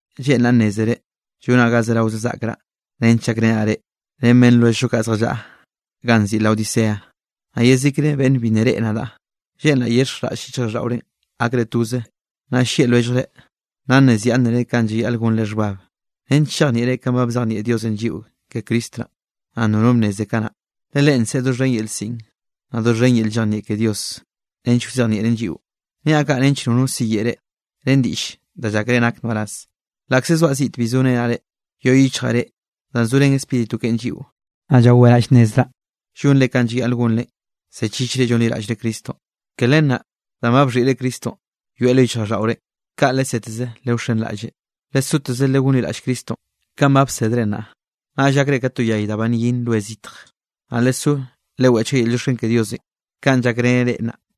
Lleꞌnraꞌ nnézere llonaꞌ ga zerao zaꞌkraꞌ nench llakrenaꞌ reꞌ, ren beꞌnn lwelljllo kaꞌ zjallaꞌa ganꞌ nziꞌi Laodicea, naꞌ yezikre beꞌnn bi nna reꞌe nadaꞌ. Lleꞌnraꞌ yexhenraꞌll yichjraꞌlldaꞌorenꞌ gakre toze, naꞌ llieꞌ lwelljre, naꞌ nnezyaꞌnnere kanꞌ llayaꞌl gonre xhbab, nench chejnieꞌre kanꞌ ba bzejnieꞌ Diosenꞌ lliꞌo ke Cristo naꞌ, danꞌ nono bnneze do kanaꞌ. Le Leꞌen nseꞌe doxhen yel siꞌn, naꞌ doxhen yel llejnieꞌ ke Dios nench wzejnieꞌren lliꞌo. Niaꞌ kaꞌ nench notno siyeꞌe reꞌ ren diꞌll da llákere nak nbaraz. Laꞌkze zoaꞌ ziꞌt bi zorenaꞌ reꞌ, yoꞌ yichjaꞌ reꞌ danꞌ zorén Spíritu keꞌen lliꞌo, naꞌ llaweraꞌ llnnezraꞌ llonre kanꞌ llayaꞌl gonre, zechichre llonliraꞌllre Cristonꞌ. Ke len naꞌ danꞌ ba bxhiꞌre Cristonꞌ yoeꞌ lo yichjraꞌlldaꞌore, kaꞌ leseteze lewxenraꞌlleꞌ. Lesoteze legonliraꞌll Cristonꞌ kanꞌ ba bsedre naꞌ, naꞌll gakre ka to yay da ba nyin roenꞌ zitj, naꞌ lesó leweꞌchga yel llioxken ke Diosenꞌ kanꞌ llakreneꞌ reꞌ naꞌ.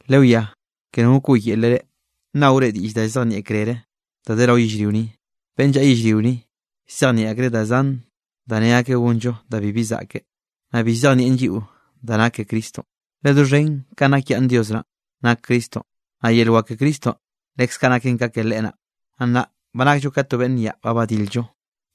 Lewiá ke no wkoꞌyele reꞌ, nnaore diꞌll da llzejnieꞌ krere da de rao yellrio ni. Beꞌnn llaꞌa yellrio ni, llzejnieꞌ akreꞌ da zan da ne akeꞌ gonllo da bibi zaꞌke, naꞌ bi llzejnieꞌn lliꞌo da nak ke Cristonꞌ. Le doxhen kanꞌ nakyaꞌnne Dios naꞌn nak Cristonꞌ, naꞌ yel wak ke Cristonꞌ leskaꞌ naken ka ke Leꞌe naꞌ. Naꞌ nnaꞌ ba nakllo ka to beꞌnn nyaꞌ ba badil-llo,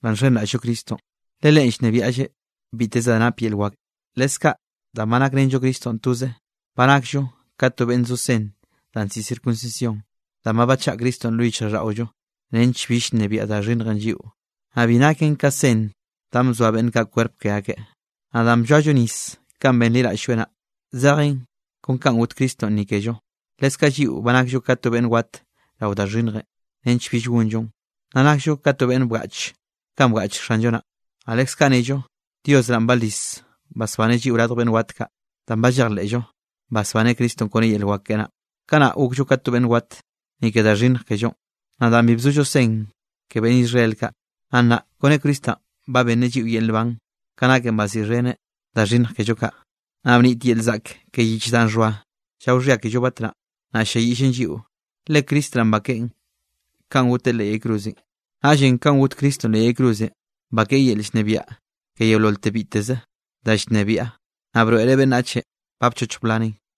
danꞌ nxenraꞌll-llo Cristonꞌ, le Leꞌen llnebiaꞌlleꞌ biteze da nap yel wak. Leskaꞌ danꞌ ba nakrenllo Cristonꞌ toze, ba nakllo ka to beꞌnn ba zo sen danꞌ nziꞌi circuncisión, danꞌ ba bachaꞌa Cristonꞌ lo yichjraꞌlldaꞌollo nench bill nnebiaꞌ da xhinnjenꞌ lliꞌo. Naꞌ bi naken ka sen danꞌ bzoa beꞌnn kaꞌ kwerp ke akeꞌ. Naꞌ danꞌ blloallo nis kanꞌ benliraꞌll-lloeꞌ naꞌ, zejen kon kanꞌ got Cristonꞌ ni kello, leskaꞌ lliꞌo ba nakllo ka to beꞌnn wat rao da xhinnjenꞌ nench bill gonllon. Naꞌ nakllo ka to beꞌnn bgaꞌch kanꞌ bgaꞌch Xanllo naꞌn, naꞌ leskaꞌ nnello Dios naꞌn balis basbaneꞌ lliꞌo radj beꞌnn wat kaꞌ, danꞌ ba llejleꞌllo basbaneꞌ Cristonꞌ kone yel wak keꞌe naꞌ. Kanaꞌ gokllo ka to beꞌnn wat, ni ke da xhinnj kellonꞌ, naꞌ danꞌ bi bzollo sen ke beꞌnn Israel kaꞌ. Naꞌ nnaꞌ kone Cristonꞌ ba benneꞌ lliꞌo yel nban, ka naken baziꞌxheneꞌ da xhinnj kello kaꞌ. Naꞌ bnit yel zaꞌk ke yich danꞌ xhoa llao xhia kello batnaꞌ, naꞌ ll-lliayiꞌllen lliꞌo. Le Cristo naꞌn bakeꞌen kanꞌ goteꞌ leꞌ yay cruzenꞌ. Naꞌllenꞌ kanꞌ got Cristonꞌ leꞌ yay cruzenꞌ, bakeꞌe yel llnebiaꞌ ke yeololte biteze da llnebiaꞌ, naꞌ broeꞌreꞌ beꞌnnachenꞌ ba bchochj blaneꞌn.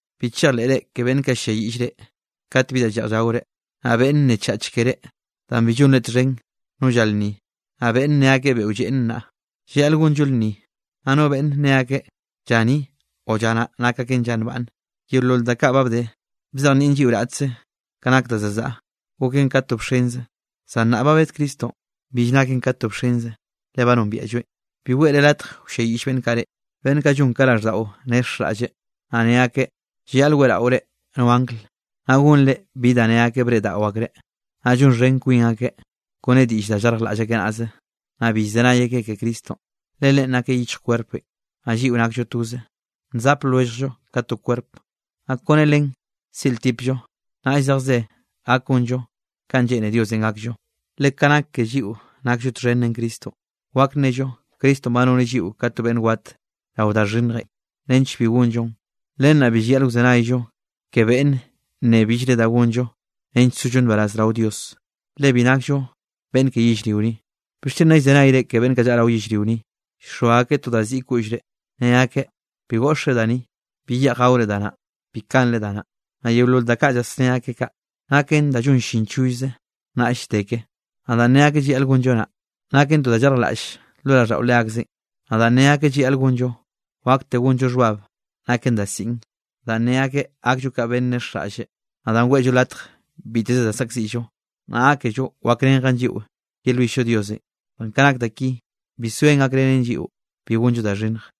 Bi chejleꞌre ke beꞌnn kaꞌ ll-lliayiꞌll reꞌ kat bi da lleꞌj llaore, naꞌ beꞌnn nnechach keré danꞌ bi llonre txhen no lla lnni, naꞌ beꞌnn ne akeꞌ beꞌo lleꞌn naꞌ, llayaꞌl gonllo lnni, naꞌ no beꞌnn ne akeꞌ lla ni o lla naꞌ nak aken lla nbaꞌnne. Yeolol da kaꞌ ba bde, bzejnieꞌn lliꞌo raꞌtze ka nak da za zaꞌa, goken ka to bxenze, zan nnaꞌ ba bed Cristonꞌ, bill naken ka to bxenze le ba nombiaꞌlloeꞌn. Bi weꞌre latj wlliayiꞌll beꞌnn kaꞌ reꞌ, beꞌnn kaꞌ llon ka raꞌlldaꞌo nexjraꞌlle, naꞌ ne akeꞌ llayaꞌl weꞌraore no angl, naꞌ gonre bi da nne akeꞌ breꞌdaꞌo akreꞌ, naꞌ llonxhen kwin akeꞌ kone diꞌll danꞌ llarjlaꞌll akeꞌ naꞌze. Naꞌ bi llzenay akeꞌ ke Cristonꞌ, le Leꞌen nakeꞌ yichj kwerpenꞌ, naꞌ lliꞌo nakllo toze, nzap lwelljllo ka to kwerp, naꞌ kone Leꞌen ziꞌltipllo, naꞌll zejze gak gonllo kanꞌ lleꞌne Diosenꞌ gakllo. Le ka nak ke lliꞌo nakllo txhen ren Cristonꞌ, wak nello Cristonꞌ ba noneꞌ lliꞌo ka to beꞌnn wat rao da xhinnjenꞌ nench bi gonllon. Len naꞌ bi llayaꞌl wzenayllo ke beꞌnn nneꞌe billre da gonllo nench sollo nbaraz rao Dios, le bill nakllo beꞌnn ke yellrio ni. ¿Bixchen nna llzenayzre ke beꞌnn kaꞌ llaꞌa rao yellrio ni, llxoa akeꞌ to da ziꞌi koꞌllre? Ne akeꞌ: “Bi goꞌxre da ni”, “Bi yeꞌj gaore da naꞌ”, “Bi kanre da naꞌ”. Naꞌ yeolol da kaꞌ llasné akeꞌ kaꞌ, naken da llon llin chollzenꞌ, naꞌll llde ke. Naꞌ danꞌ ne akeꞌ llayaꞌl gonllo naꞌ, naken to da llarjlaꞌllze lo raꞌlldaꞌo leakzeꞌn. Naꞌ danꞌ ne akeꞌ llayaꞌl gonllon, wakte gonllo xhbab naken da siꞌn, danꞌ ne akeꞌ gakllo ka beꞌnn nexjraꞌllre, naꞌ danꞌ weꞌllo latj biteze da saꞌkziꞌllo, naꞌ gákello wakrenjen lliꞌo yelwill-llo Diosenꞌ. Zan ka nak da ki, bi zoen gakrenen lliꞌo bi gonllo da xhinnj.